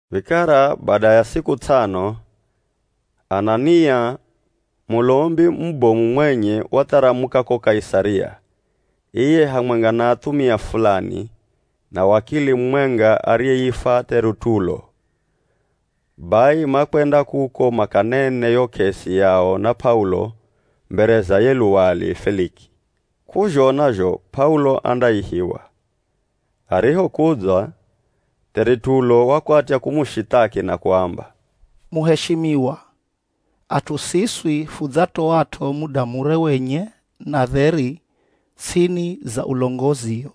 Vikara bada ya siku ts'ano, Anania, Mulombi mubomu mwenye watharamuka ko Kaisaria, iye hamwenga na athumia fulani, na wakili mumwenga ariyeifwa T'eritulo. Bai makwenda kuko makanene yo k'esi yao na P'aulo mbere za ye luwali Feliki. K'uzhona zho P'aulo andaihiwa. Arihokudza, T'eritulo wakwatya kumushithaki na kuamba, “Muheshimiwa, at'u siswi fudzatoat'o muda mure wenye na dheri ts'ini za ulongozio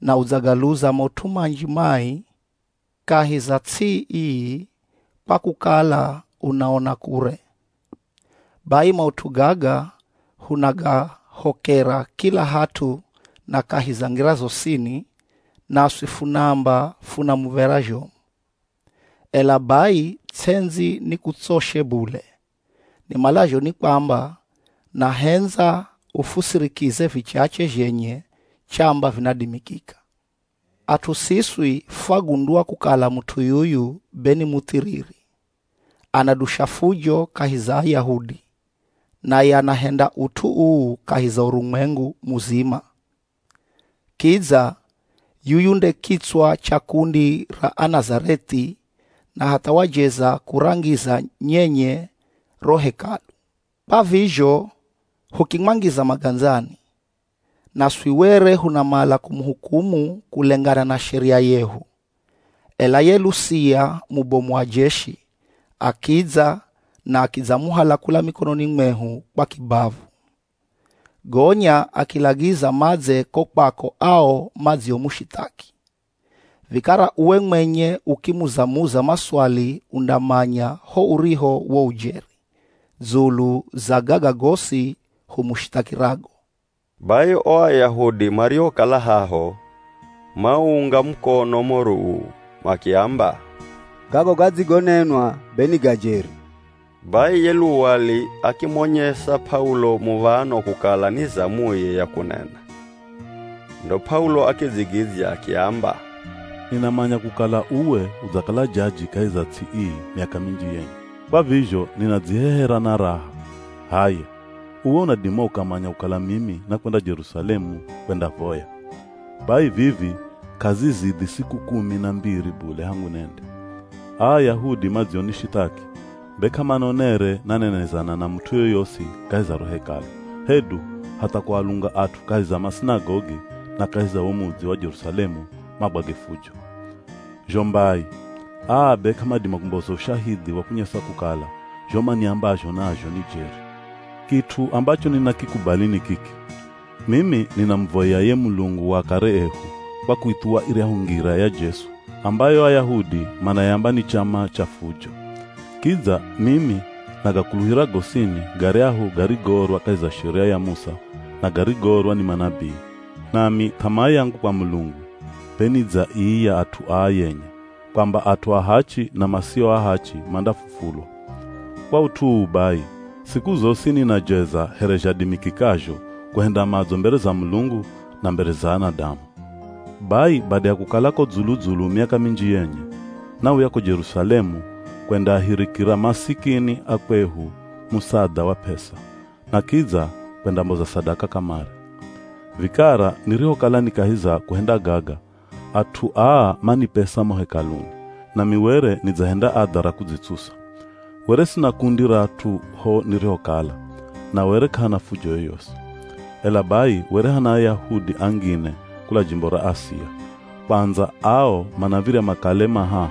na udzagaluza maut'u manji mai kahi za ts'i ii kwa kukala unaona kure. Bai maut'u gaga hunagahokera kila hat'u na kahi za ngira zosini, naswi funaamba funa muv̱era zhomu. Ela bai ts'endzi ni kutsoshe bule, nimalazho ni kwamba, nahendza ufusirikize vichache zhenye chamba vinadimikika. “At'u siswi fwagundua kukala mut'u yuyu be ni muthiriri. Anadusha fujo kahi za Ayahudi, naye anahenda ut'u uu kahi za urumwengu muzima. Kidza yuyu nde kitswa cha kundi ra Anazareth'i, na hatha wajeza kurangiza nyenye ro Hekalu, kwa vizho hukimwangiza magandzani. [Naswi were hunamala kumuhukumu kulengana na sheria yehu, ela ye Lusia mubomu wa jeshi akidza na akidzamuhala kula mikononi mwehu kwa kibavu. Gonya akilagiza madze ko kwako ao madziomushithaki.] Vikara uwe mwenye ukimuza-muza maswali undamanya ho uriho wo ujeri dzulu za gaga gosi humushithakirago.” Bai o Ayahudi mariokala haho, mauunga mukono moro uu, makiamba, “Gago gadzigonenwa be ni ga jeri.” Bai ye luwali akimonyesa P'aulo muv̱ano kukala ni zamuye ya kunena. Ndo P'aulo akidzigidzya akiamba, “Ninamanya kukala uwe udzakala jaji kahi za ts'i ii miaka minji yenye, kwa vizho ninadzihehera na raha. H'aya, uwe unadima ukamanya kukala mimi nakwenda Jerusalemu kwendavoya. Bai vivi k'azizidhi siku kumi na mbiri bule hangu nende. Aa Ayahudi madzionishithaki be k'amanonere nanenezana na mut'u yoyosi kahi za ro Hekalu, hedu hatha kualunga at'u kahi za masinagogi na kahi za wo mudzi wa Jerusalemu magwage fujo. Zho mbai, aa be k'amadima kumboza ushahidhi wa kunyesa kukala zho maniambazho nazho ni jeri. Kit'u ambacho ninakikubali ni kiki, mimi ninamuvoya ye Mulungu wa akare ehu kwa kuithuwa iryahu Ngira ya Jesu ambayo Ayahudi manayamba ni chama cha fujo. Kidza mimi nagakuluhira gosini garyahu garigoorwa kahi za Sheria ya Musa na garigoorwa ni manabii, nami th'amaa yangu kwa Mulungu be ni dza ii ya at'u aa yenye, kwamba at'u ahachi na masio ahachi mandafufulwa. Kwa ut'u uu bai, siku zosi ninajeza here zhadimikikazho kuhenda madzo mbere za Mulungu na mbere za anadamu. “Bai bada ya kukala ko dzulu-dzulu miaka minji yenye, nauya ko Jerusalemu kwendaahirikira masikini a kwehu musadha wa p'esa, na kidza kwendamboza sadaka kamare. Vikara nirihokala ni kahi za kuhenda gaga, at'u aa manipesa mo Hekaluni, nami were nidzahenda adha ra kudzitsusa. Were sina kundi ra at'u ho nirihokala, na were k'ahana fujo yoyosi. Ela bai were hana Ayahudi angine kula jimbo ra Asia, kwandza ao manav̱irya makale ma haha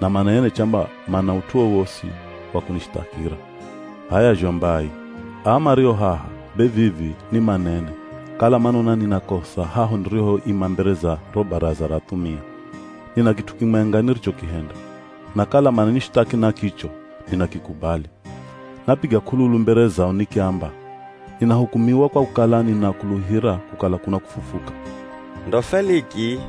na manene chamba mana ut'u wowosi wa kunishithakira. H'aya zho mbai, aa mario haha, be vivi ni manene kala manona nina kosa haho nirihoima mbere za ro Baraza ra athumia. Nina kit'u kimwenga nirichokihenda, na kala mananishithaki na kicho, ninakikubali. Napiga k'ululu mbere zao nikiamba, ‘Ninahukumiwa kwa kukala ninakuluhira kukala kuna kufufuka.’” Ndo Feliki,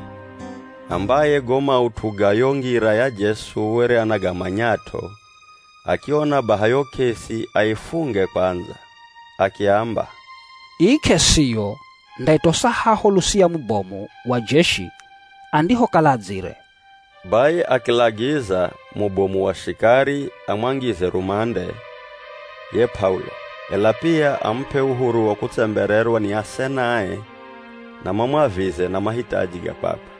ambaye go maut'u ga yo Ngira ya Jesu were anagamanyat'o, akiona baha yo k'esi aifunge kwandza, akiamba, “Ii k'esiyo ndaitosa haho Lusia mubomu wa jeshi andihokala adzire.” Bai akilagiza mubomu wa shikari amwangize rumande ye P'aulo, ela pia amup'e uhuru wa kutsembererwa ni asenae na mamwavize na mahitaji ga kwakwe.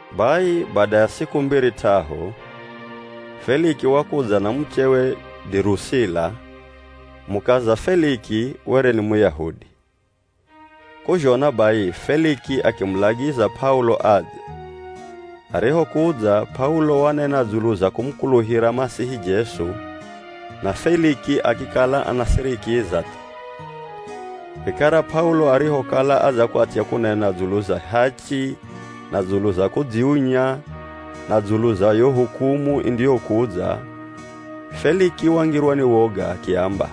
Bai bada ya siku mbiri t'ahu, Feliki wakudza na muchewe Dirusila. Mukaza Feliki were ni Muyahudi. K'uzhona bai, Feliki akimulagiza P'aulo adze, arihokudza P'aulo wanena dzulu za kumukuluhira Masihi Jesu na Feliki akikala anasirikiza thu. Vikara P'aulo arihokala adzakwatya kunena dzulu za hachi na dzulu za kudziunya, na dzulu za yo hukumu indiyokudza, Feliki wangirwa ni woga akiamba,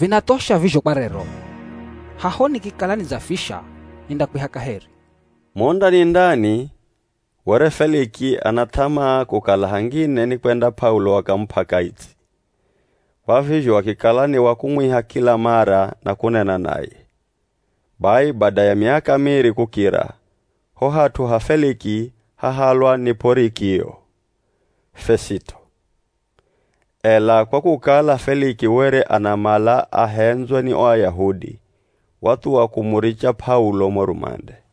“Vinathosha vizho kwa rero! Haho nikikala nidzafisha nindakwiha kaheri.” Mo ndani-ndani were Feliki ana th'amaa kukala hangine nikwenda P'aulo akamup'a kaitsi, kwa vizho akikala ni wa kumwiha kila mara na kunena naye. Bai bada ya miaka miri kukira, ho hat'u ha Feliki hahalwa ni P'orikio Fesito, ela kwa kukala Feliki were anamala ahendzwe ni o Ayahudi, wathuwa kumuricha P'aulo mo rumande.